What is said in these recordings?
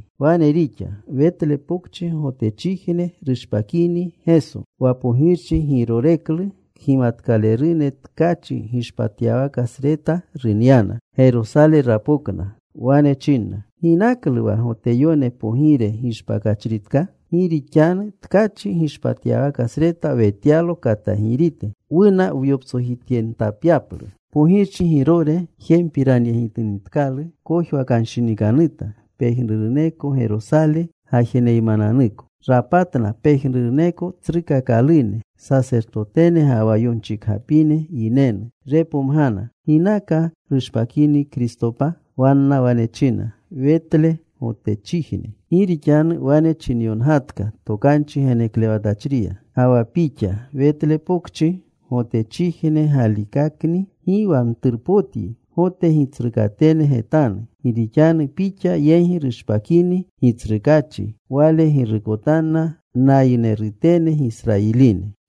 Wane rixa. Wetle Pokchi Gotechijne rushpakini Geso, wa pogirchi Giroreklu, kgimatkalerune tkachi gishpatyawaka sreta runyana. Gerosale rapokna. Wane chinna, “¿Ginaklu wa Goteyone Pogire gishpakachritka? Gi rixanu tkachi gishpatyawaka sreta wetyalo katagirite. Wuna wyoptsojityentapyaplu.” Pogirchi Girore jempiranyegitinitkalu, kojwakanshinikanuta, pejnuruneko Gerosale gajeneymananuko. Rapatna pejnuruneko tsrukakalune sasertotene ga wa yonchikgapine yinenu. Repomgana ginaka rushpakini Kristopa. Wanna wane china, “Wetle, Gotechijne. Gi rixanu wane chinyongatka tokanchi geneklewatachriya: Ga wa pixa, Wetle Pokchi, Gotachijne, Galikakni gi wa mturpotyi, Gota gitsrukatene getanu, Gi rixanu pixa yegi rushpakini Gitsrukaachi. Wale girukotanna nayinerutene Gisrayiline.”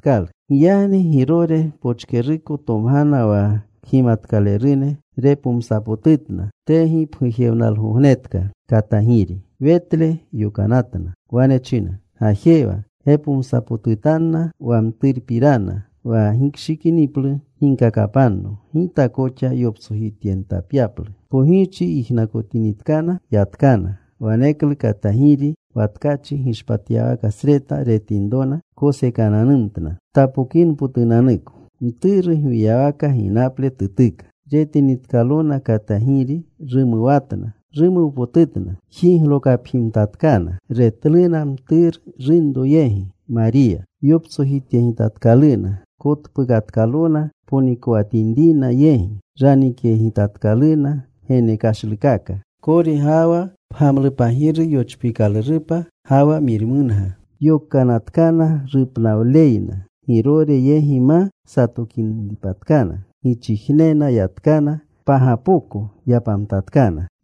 Giyagni Girore pochkeruko tomgana wa kgimatkalerune. Repomsapotutna tegipgujewnalgognetka katagiri. Wetle yokanatna. Wane china, “Gajewa. Gepomsapotutanna wa mturu pirana. Wa gikshikiniplu ginkakapanno, gita koxa yoptsojityentapyaplu.” Pogirchi yijnakotinitkana, yatkana. Waneklu katagiri wa tkachi gishpatyawaka sreta retinrona, kosekananumtna, tapokinpotuko; mturu gwiyawaka ginaple tutuka. Retinitkalona katagiri, rumuwatna. Rumuwpotutna. Jiglokapjimtatkana, retluna mturu runroyegi, Mariya. Yoptsojityegitatkaluna. Kotpukatkalona ponikowatinrina yegi. Ranikyegitatkaluna genekashlukaka: kori ga wa pgamlupagiri yochpiikalurupa, ga wa mirmunga. Yokanatkana rupnawleyna Girore yegi ma satokinitpatkana, gichijnena yatkana. Pagapoko yapamtatkana.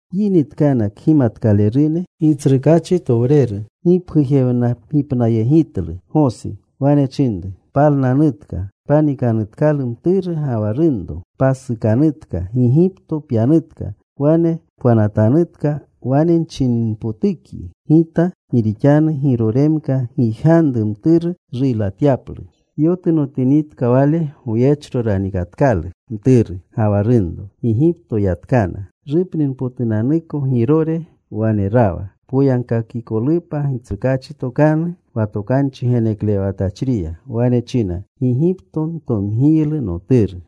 Yinitkana kgimatkalerune, Gitsrukaachi towreru gipgujewnagipnayegitlu Gosi. Wane chinru, “Palnanutka. Panikanutkalu mturu ga wa runro. Pasukanutka. Gigipto pyanutka. Wane pwanatanutka wane nchininpotukyi Gita. Gi rixanu Giroremka gijganru mturu ruylatyaplu.” Yotunotinitka wale, goyechno ranikatkalu mturu ga wa runro. Gigipto yatka. Rupninipotunanuko Girore wane rawa, poyagkakikolupa Gitsrukaachi tokanu wa tokanchi geneklewatachriya. Wane china: Gigipto ntomgiylu Noturu.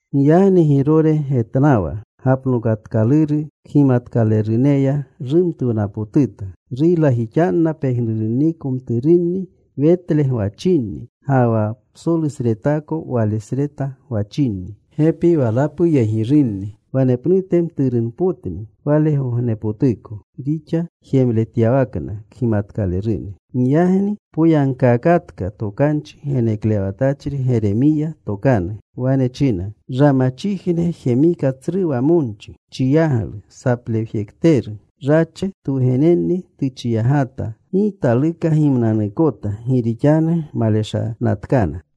Giyagni Girore getnawa gapnokatkaluru kgimatkaleruneya, rumtuwnapotuta. Ruylajixanna pejnurunniko mturunni Wetle gwachinni ga wa psolu sretako wale sreta gwachinni, gepi walapuyegirunni, wanepnute mturunpotni walegognepotuko rixa jemletyawakna kgimatkalerune. Giyagni poyagkaakatka tokanchi geneklewatachri Geremiya tokanu. Wane china: Ramachijne jemika tsru wamonchi: chiyaglu, saplewjekteru. Rache twugenenni tuchiyagata. Gi taluka gimnanuukota, gi rixanu maleshanatkana.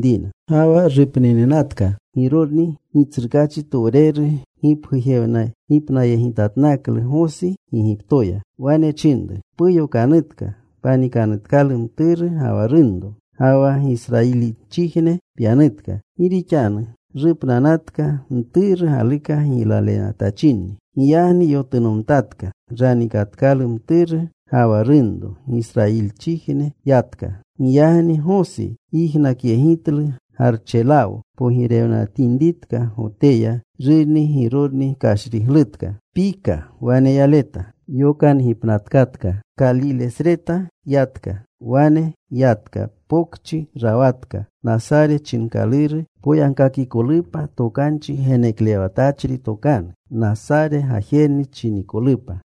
Ga wa rupnininatka Girorni, Gitsrukaachi towreru gipgujewnagipnayegitatnaklu Gosi Gigiptoya. Wane chinru, “Puyokanutka. Panikanutkalu mturu ga wa runro, ga wa Gisrayilinchijne pyanutka. Gi rixanu rupnanatkana mturu galuka giylaletachinni.” Giyagni yotunomtatka. Ranikatkalu mturu ga wa runro. Gisrayilichijne yatka. Giyagni Gosi yijnakyegitlu Garchelawo pogirewatinritka Goteya, rurni Girorni kashriglutka, pika wane yaleta. Yokangipnatkatka. Kalilesreta yatka. Wane yatka. Pokchi rawatka, Nasare chinkaluru, poyagkakikolupa tokanchi geneklewatachri tokanu: Nasare gajeru chinikolupa.